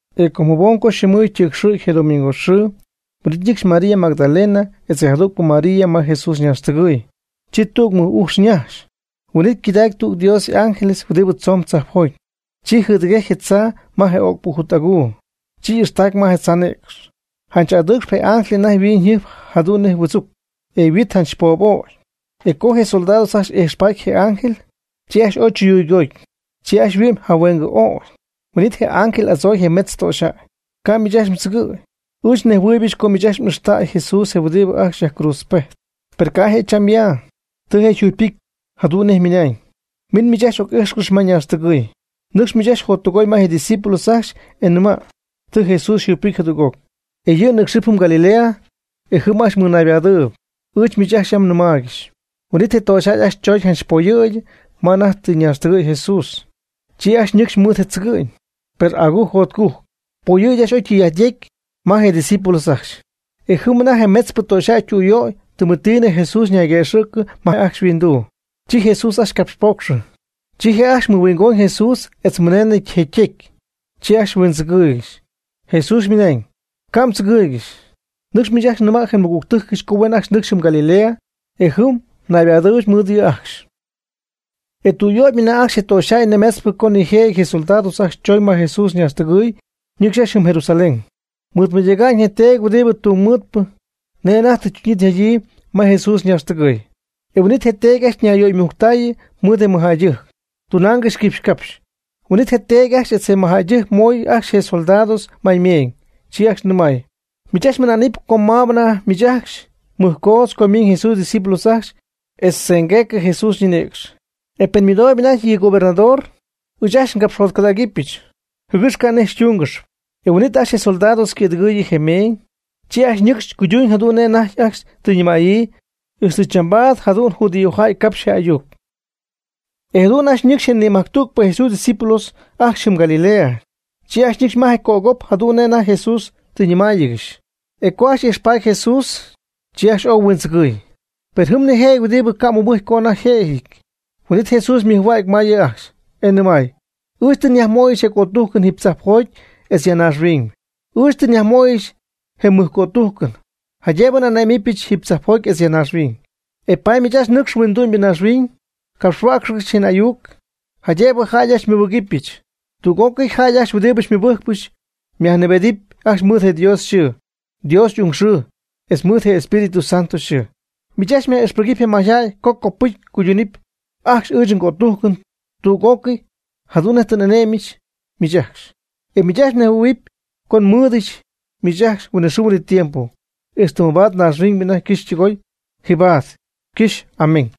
E com jabom co yxɨmɨ̈y ytɨcxɨ̈gy je domingo xɨɨ, huin'it ñɨcxy María Magdalena etz je jadügpɨ María ma Jesús ñaaxtɨgɨ̈y. Chi tüg mɨj ujx ñajxy. Huin'it ycɨdacy Dios tüg y'ángel huɨdibɨ tzomb tzajpjoty. Chi jɨdɨgejcy je tzaa ma je öcpɨ jut aguu. Chi y'ixtacy ma tzaa nïcx. Janch adɨɨcxp je ángel anajty yhuinjɨjp jadu'n nej huɨdzuc, e je yhuit janch poob'ögy. E co je soldados ajcxy ijxpaty je ángel, chi ajcxy ooy chuyuygooty. Chi ajcxy yhuɨ'my jahuengɨ ögy. Huin'it je ángel y'adzooy je metz töxyjäy: ―Ca' miich ajcxy mdzɨgɨ̈y. Ɨɨch nejhuɨɨybɨch co miich ajcxy m'ixtäy Jesús je huɨdibɨ ajcxy yajcruudzpejty. Per ca' je' cham ya. Tɨ je' yjugypɨcy, jadu'n nej ymɨnañ. Min miich ajcxy oc'ix ma ñaaxtɨgɨɨy. Nɨcx miich ajcxy jottɨgooyb ma je' ydiscípulos ajcxy e nima': “Tɨ Jesús yjugypɨcy jadüg'oc, e yɨ' ñɨcxɨp jɨm Galilea e jɨm ajcxy mmɨɨdnaybadɨɨyb.” Ɨɨch miich ajcxy yam nnɨmaaygɨxy. Huin'it je töxyjäy ajcxy chooñ janch poyɨ̈gy ma anajty tɨ ñaaxtɨgɨ̈y Jesús. Chi ajcxy ñɨcxy mɨɨd tzɨgɨ'ñ, per agujc jotcujc. Poyɨ̈gy ajcxy oy tɨy'ajt yecy ma je discípulos ajcxy. E jɨm anajty je metzpɨ töxyjäy ytüyöy, tɨmetinɨ Jesús ñayguëxɨ̈cɨ ma je' ajcxy yhuinduu. Chi Jesús ajcxy capxpocxy. Chi je' ajcxy mɨhuingoñ Jesús etz mɨneenɨ je' ytecy. Chi ajcxy huindzɨgɨɨygɨxy. Jesús mɨnañ: ―Ca' mdzɨgɨɨygɨxy. Nɨcx miich ajcxy nɨma' je nmɨgügtɨjcɨch co huen ajcxy nɨcxy jɨm Galilea, e jɨm naybadɨɨybɨch mɨɨd yɨ' ajcxy. E tüyöybñɨ anajty je töxyjäy nimetzpɨ co nijëjɨty je soldados ajcxy chooñ ma Jesús ñaaxtɨgɨɨy ñɨcxy jɨm Jerusalén, mɨɨdmɨydäga'ñ je teedy huɨdibɨ tungmɨɨdpɨ nej anajty tɨ ytuñyii tɨ yjadyii ma Jesús ñaaxtɨgɨɨy. E huin'it je teedy ajcxy ñayyöymujctayɨ mɨɨd je mɨjjäydɨjc, tunaangɨxy quipxy capxy. Huin'it je teedy ajcxy etz je mɨjjäydɨjc moy ajcxy je soldados may meeñ. Chi ajcxy nɨmay: ―Miich ajcxy mɨna'nɨp co maab anajty miich ajcxy mɨjcoodz co ymiiñ Jesús ydiscípulos ajcxy etz tzɨmgueecɨ Jesús ñinïcx. Etz pen ymɨdooyb anajty yɨ gobernador, ɨɨch ajcxy ngapxjotcɨdägɨch, jɨgɨx ca' nej xytúngɨxɨpy. E huin'it ajcxy je soldados ycɨ̈dɨgɨɨyɨ je meeñ. Chi ajcxy ñɨcxy cuyduñ jadu'n nej anajty ajcxy tɨ ñɨmäyii. E ixtɨ chambaad jadu'n judíojäy capx je ayuc. E jadu'n ajcxy ñɨcxy je nimajctügpɨ Jesús ydiscípulos ajcxy jɨm Galilea. Chi ajcxy ñɨcxy ma je cögop jadu'n nej anajty Jesús tɨ ñɨmáayɨgɨxy. E co ajcxy ijxpaty Jesús, chi ajcxy oy huindzɨgɨɨy. Per jɨm nijëjɨty huɨdibɨ ca' mɨbɨjcy co anajty yjëjɨty. Huin'it Jesús ymɨjhua'cy ma yɨ' ajcxy, e nɨmay: ―Ɨɨch tɨ nyajmöyɨch je cötujcɨn jiiby tzajpjoty etz ya naaxhuiñ. Ɨɨch tɨ nyajmöyɨch je mɨj cötujcɨn, jaydëbɨ n'ane'myɨch jiiby tzajpjoty etz ya naaxhuiñ. E paady nɨcx miich ajcxy huindu'my naaxhuiñ capxhuäcxcɨx je ayuc, jaydëbɨ jäy ajcxy xymɨbɨgɨpyɨch. Tüg'ócɨy jäy ajcxy huɨdibɨ xymɨbɨjcpɨch myajnɨɨbedɨpy ajcxy mɨɨd Dios yxɨɨ, Dios y'ung yxɨɨ, etz mɨɨd je Espíritu Santo yxɨɨ. Miich ajcxy myaj'ixpɨgɨpy je mayjäy co copɨcy cuydunɨpy ajcxy ɨɨch ngötujcɨn tüg'ócɨy jadu'n nej tɨ n'ane'myɨch miich ajcxy. E miich ajcxy mnejhuɨɨyb co nmɨɨd'ityɨch miich ajcxy huinɨxɨɨ huinɨtiempo, ixtɨ mabaad naaxhuiñybɨ anajty ycɨxpɨ ytɨgooy. Jibaad ycɨxy. Amén.